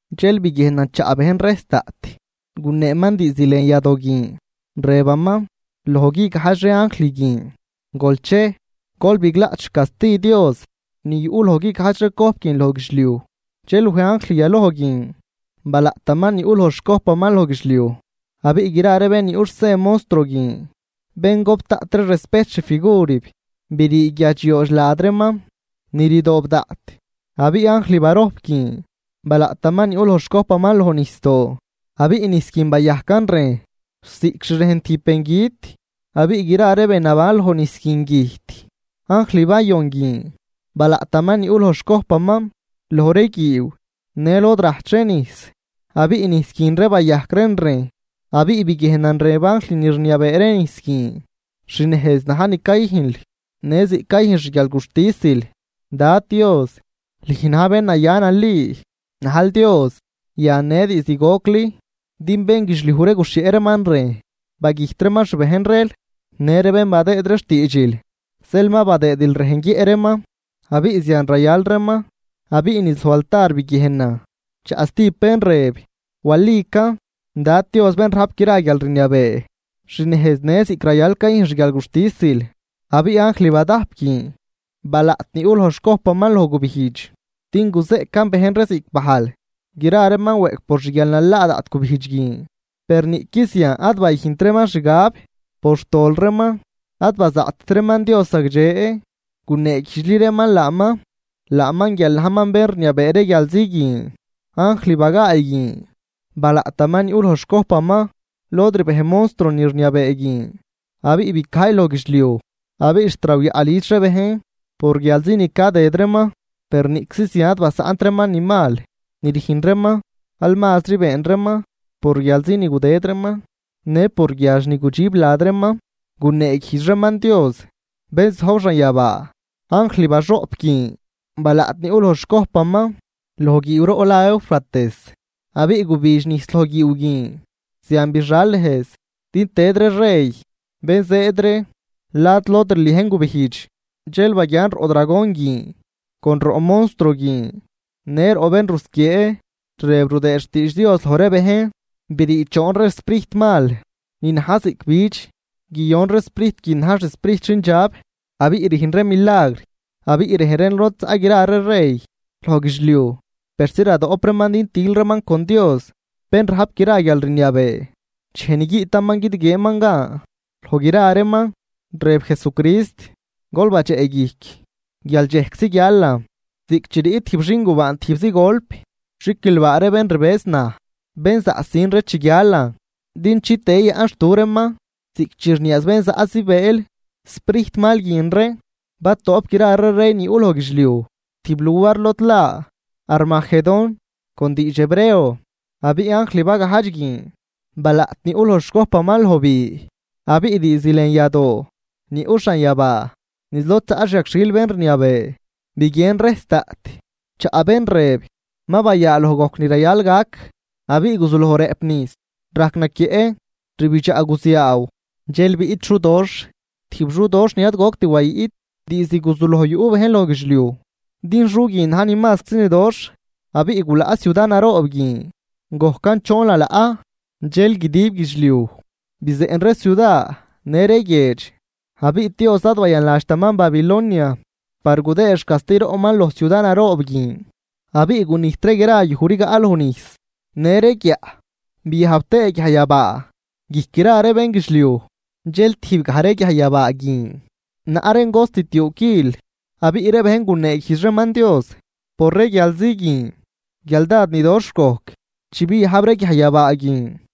Dxel biguiejnan chaꞌ bejn rejs daꞌt guneeman diizd lën yadoo guin, rëbaman loj guigajdx ree anjl guin: ―Gol chej, gol biglaꞌt xcasti Dios ni yuꞌ loj guigajdx ree cojp guin loj guidxliuj. Dxel wej anjl yaloj guin, balaꞌtaman ni yuꞌ loj xcojpaman loj guidxliuj. Abiꞌ gra ree bén ni yuꞌ xsen montruo guin bén gop daꞌt ree respejt xfigurib, brii guiadxyoodx lad reeman, ni rdoob daꞌt. Abiꞌ anjl barojp guin balaꞌtaman ni yuꞌ loj xcojpaman loj nijsdoo. Abiꞌ nijs guin bayajcan rejn ziꞌc xrejn tijb bengüt abiꞌ gra ree be naban loj nijs guin güjt. Anjl bayon guin balaꞌtaman ni yuꞌ loj xcojpaman loj ree guiiw në lod rajch ree nijs abiꞌ nijs guin ree bayajc reen rejn. Abiꞌ biguiejnan rëb anjl ni rniabee ree nijs guin: ―Xnejz na̱j ni cayüjnl në ziꞌc cayüjn xguialguxtisil, Dad Dios, lüj na̱j bén naya nali, najl Dios yan në diizd gocli. Din bénguidxliuj ree guxhieꞌ reeman rejn bagüjt reeman xbejn reel në ree bén badëëd ree xtiidxil. Zeel ma badëëdil rejn guiëꞌ reeman, abiꞌ zian rayal reeman. Abiꞌ niz loj altar biguiejnan chaꞌ stijb bén rëb: ―Walican, Dad Dios bén rajp gra guialrniabee. Xnejz në ziꞌc rayal cayüjn xguialguxtisil. Abiꞌ anjl badajp guin balaꞌt ni yuꞌ loj xcojpaman loj gubijdx din guzeꞌcan bejn ree ziꞌc bajl. Gra reeman weꞌc por xguialnalaa daꞌt gubijdx guin. Per niꞌqui zian ad bayüjnt reeman xgab por xtol reeman, ad bazaꞌtt reeman Dios zagdxe guneeguijdxli reeman laaman, laaman guial najman bén rniabee ree guialzi guin. Anjl bagaay guin balaꞌtaman ni yuꞌ loj xcojpaman lod rbej monstruo ni rniabee guin, abiꞌ bicajy loj guidxliuj, abiꞌ xt rawyaꞌ lüdx ree bejn por guialzi ni cadëd reeman. Per niꞌczi zian ad basaꞌnt reeman ni mal ni rüjn reeman, al mazri been reeman por guialzi ni gudëd reeman në por guiadx ni gudxib lad reeman, guneeguijdx reeman Dios bén zojb xanyabaa. Anjl baxoꞌp guin balaꞌt ni yuꞌ loj xcojpaman loj guiiwroꞌ la Eufrates abiꞌ gubidx nijs loj guiiw guin. Zian bixal nejz din tëd ree rey bén zëëd ree lad lod rliejn gubijdx. Dxel baguian roꞌ dragon guin, con roꞌ monstruo guin në roꞌ bén rusquiee rëb rudëë xtiidx Dios loj ree bejn brii choon ree sprijt mal ni na̱j ziꞌc bidx. Guiyon ree sprijt guin na̱j xsprijt xindxab, abiꞌ rüjn reen milagr abiꞌ rej reen lod zaꞌ gra ree rey loj guidxliuj persi radoꞌp reeman din til reeman con Dios bén rajp gra guialrniabee, dxej ni guiꞌtaman guidguieenman gan loj gra reeman. Rëb Jesucrist: ―Gol badxeꞌguijc guial dxejczi guialan ziꞌc chi riꞌt tijb xingubaan tijbzi golp. Xiquilbaa ree bén rbëz naj, bén zaꞌsin ree chi guialan din chitëë yayaꞌnxtu reeman ziꞌc chi rniaaz bén zaꞌ zibëël. Sprijt mal guin ree batoꞌp gra ree rey ni yuꞌ loj guidxliuj tijb luar lod la Armagedón con diidx hebreo. Abiꞌ anjl bagajdx guin balaꞌt ni yuꞌ loj xcojpaman loj bi, abiꞌ diizd lën yadoo ni yuꞌ xanyabaa niz lod zaꞌ xyagxhil bén rniabee, biguien rejs daꞌt chaꞌ bén rëb: ―Ma bayaaloj gojc ni rayal gac. Abiꞌ guzuloj rëꞌp nijs, rajc naquieꞌ, rbidxaꞌ guziaaw dxel biꞌt xudoxh, tijb xudoxh ni ad goct wayiꞌt diizd guzuloj yuꞌ bejn loj guidxliuj, din xu guin na̱j ni mazczi ni doxh. Abiꞌ gulaꞌ ciuda naroob guin gojcan choon lalaꞌ, dxel guidib guidxliuj bizeꞌn ree ciuda në ree guiedx. Abiꞌ Dios ad bayanladxtaman Babilonia par gudëë xcasti roꞌman loj ciuda naroob guin. Abiꞌ gunijt ree gra yuj rigaꞌ loj nijsdoo në ree guiaꞌ. Biajb tëë guiajyabaa guijc ree gra ree bénguidxliuj, dxel tijbgaj ree guiaj yabaa guin naꞌ reen cost tiuu quil. Abiꞌ ree bejn guneeguijdx reeman Dios, por ree guialzi guin, guial dád ni doxh gojc chi biajb ree guiajyabaa guin.